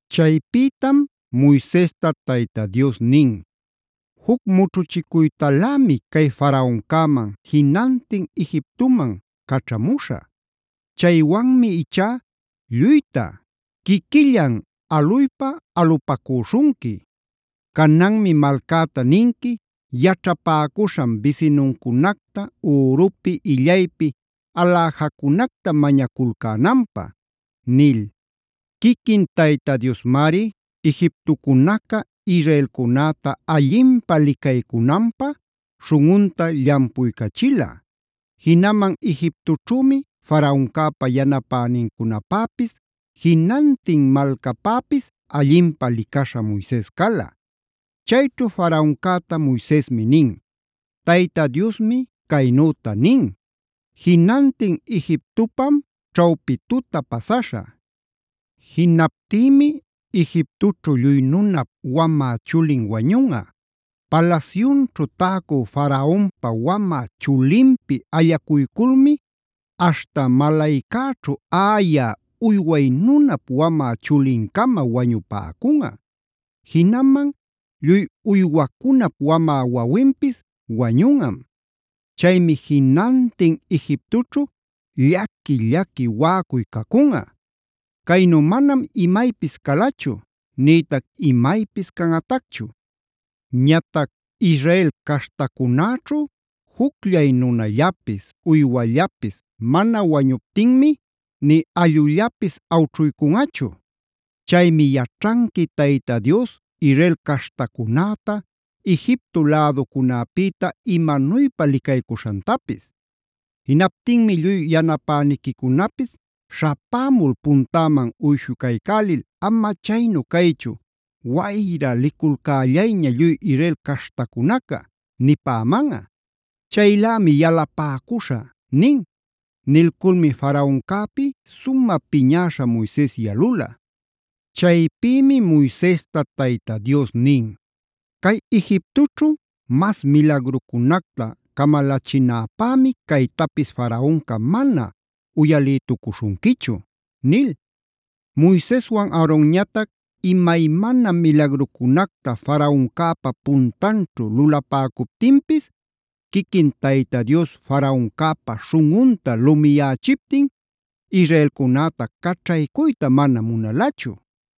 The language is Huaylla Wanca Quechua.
Chaypïtam Moisesta Tayta Dios nin: “Juc mućhuchicuytalämi cay Faraoncäman jinantin Egiptoman caćhamuśhä. Chaywanmi ichá lluyta quiquillan aluypa alupäcuśhunqui. Cananmi malcäta ninqui yaćhapäcuśhan bisinuncunacta ürupi, illaypi aläjacunacta mañaculcänanpä” nil. Quiquin Tayta Diosmari Egiptocunaca israelcunäta allinpä licaycunanpä śhunꞌunta llampuycachila. Jinaman Egiptoćhümi Faraoncäpa yanapänincunapäpis jinantin malcapäpis allinpä licaśha Moises cala. Chayćhu Faraoncäta Moisesmi nin: “Tayta Diosmi caynüta nin: ‘Jinantin Egiptopam ćhawpi tuta pasaśhä. Jinaptïmi Egiptoćhu lluy nunap wamä chulin wañunꞌa. Palasyunćhu täcü Faraonpa wamä chulinpi allacuyculmi aśhta malaycäćhu aꞌayä uyway nunap wamä chulincama wañupäcunꞌa. Jinaman lluy uywacunap wamä wawinpis wañunꞌam. Chaymi jinantin Egiptoćhu llaqui-llaqui waꞌacuy cacunꞌa. Caynu manam imaypis calachu nïtac imaypis canꞌatacchu. Ñatac Israel caśhtacunäćhu jucllay nunallapis, uywallapis mana wañuptinmi nï allꞌullapis awćhuycunꞌachu. Chaymi yaćhanqui Tayta Dios Israel caśhtacunäta Egipto läducunäpïta imanuypa licaycuśhantapis’. Jinaptinmi lluy yanapäniquicunapis śhapämul puntäman uyshucaycälil: ‘Ama chaynu caychu, wayra liculcällayña lluy Israel caśhtacunaca’ nipämanꞌa. Chaylämi yalupäcuśhä” nin. Nilculmi Faraoncäpi sumä piñäśha Moises yalula. Chaypïmi Moisesta Tayta Dios nin: “Cay Egiptoćhu mas milagrucunacta camalachinäpämi caytapis Faraonca mana uyalïtucuśhunquichu” nil. Moiseswan Aaronñatac imaymana milagrucunacta Faraoncäpa puntanćhu lulapäcuptinpis, quiquin Tayta Dios Faraoncäpa śhunꞌunta lumiyächiptin israelcunäta caćhaycuyta mana munalachu.